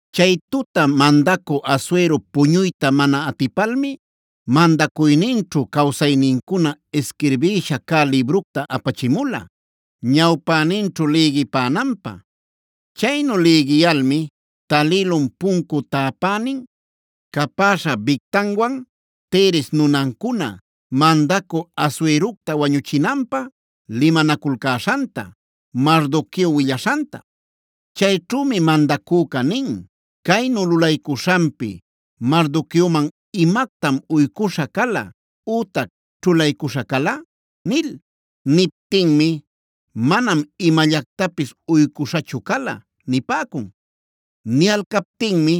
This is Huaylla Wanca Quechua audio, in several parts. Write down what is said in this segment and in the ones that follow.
Chay tuta mandacü Asuero puñuyta mana atipalmi, mandacuyninćhu cawsaynincuna isquirbïsha cä libructa apachimula, ñawpäninćhu lïgipänanpä. Chaynu lïgiyalmi talïlun puncu täpänin capäśha Bigtanwan Teres nunancuna mandacü Asuerocta wañuchinanpä limanaculcäśhanta Mardoqueo willaśhanta.a Chayćhümi mandacüca nin: “¿Caynu lulaycuśhanpi Mardoqueoman imactam uycuśha cala ütac ćhulaycuśha cala?” nil. Niptinmi: “Manam imallactapis uycuśhachu cala” nipäcun. Niyalcaptinmi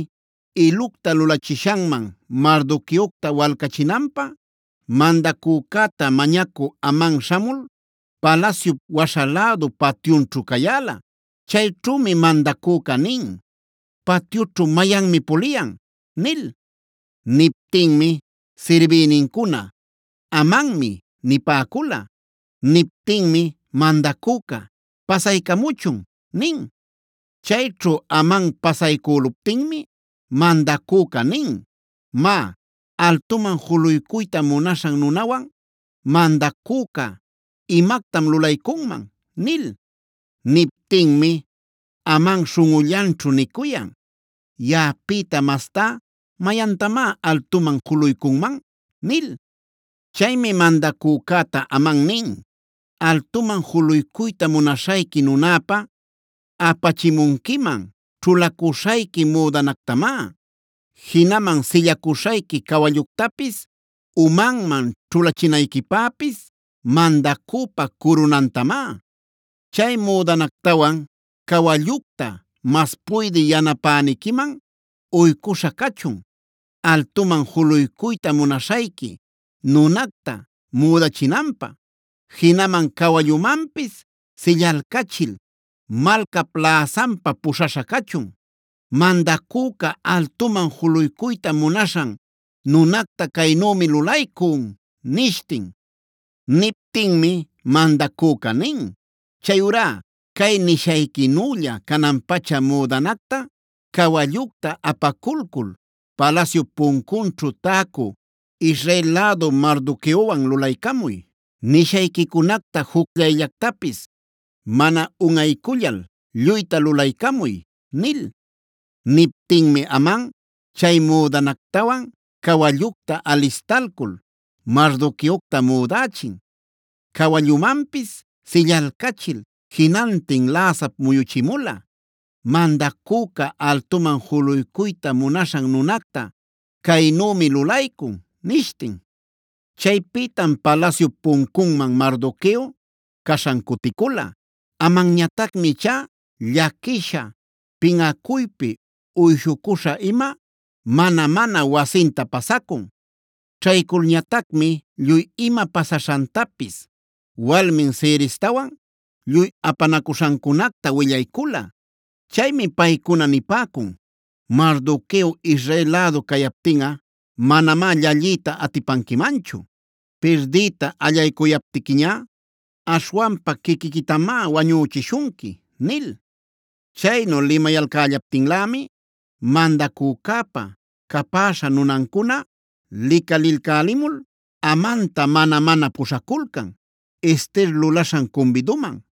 ilucta lulachishanman Mardoqueocta walcachinanpä mandacücäta mañacü Aman śhamul, palasyup waśha lädu patyunćhu cayäla. Chayćhümi mandacüca nin: “¿Patyućhu mayanmi puliyan?” nil. Niptinmi sirbïnincuna: “Amanmi” nipäcula. Niptinmi mandacüca: “Pasaycamuchun” nin. Chayćhu Aman pasaycüluptinmi mandacüca nin: “Má, ¿altuman juluycuyta munaśhan nunawan mandacüca imactam lulaycunman?” nil. Niptinmi Aman śhunꞌullanćhu nicuyan: “¿Yaꞌapïta mastá, mayantamá altuman juluycunman?” nil. Chaymi mandacücäta Aman nin: “Altuman juluycuyta munaśhayqui nunäpä, apachimunquiman ćhulacuśhayqui müdanactamá, jinaman sillacuśhayqui cawalluctapis, umanman ćhulachinayquipäpis mandacüpa curunantamá. Chay müdanactawan cawallucta mas puydï yanapäniquiman uycuśha cachun, altuman juluycuyta munaśhayqui nunacta müdachinanpä, jinaman cawallumanpis sillalcachil malcap läsanpa puśhaśha cachun: ‘Mandacüca altuman juluycuyta munaśhan nunacta caynümi lulaycun’” nishtin. Niptinmi mandacüca nin: “Chayurá cay nishayquinülla canan-pacha müdanacta, cawallucta apaculcul palasyup puncunćhu täcu Israel lädu Mardoqueowan lulaycamuy. Nishayquicunacta jucllayllactapis mana unꞌaycullal lluyta lulaycamuy” nil. Niptinmi Aman chay müdanactawan cawallucta alistalcul Mardoqueocta müdächin, cawallumanpis sillalcachil jinantin läsap muyuchimula: “Mandacüca altuman juluycuyta munaśhan nunacta caynümi lulaycun” nishtin. Chaypïtam palasyup puncunman Mardoqueo caśhan cuticula. Amanñatacmi ichá llaquisha, pinꞌacuypi uyshucuśha-ima, mana-mana wasinta pasacun. Ćhayculñatacmi lluy ima pasaśhantapis walmin Zerestawan lluy apanacuśhancunacta willaycula. Chaymi paycuna nipäcun: “Mardoqueo Israel lädu cayaptinꞌa manamá llalliyta atipanquimanchu. Pirdiyta allaycuyaptiquiñá aśhwanpa quiquiquitamá wañüchishunqui” nil. Chaynu limayalcällaptinlämi mandacücäpa capäśha nunancuna licalilcälimul Amanta mana-mana puśhaculcan Ester lulaśhan cumbiduman.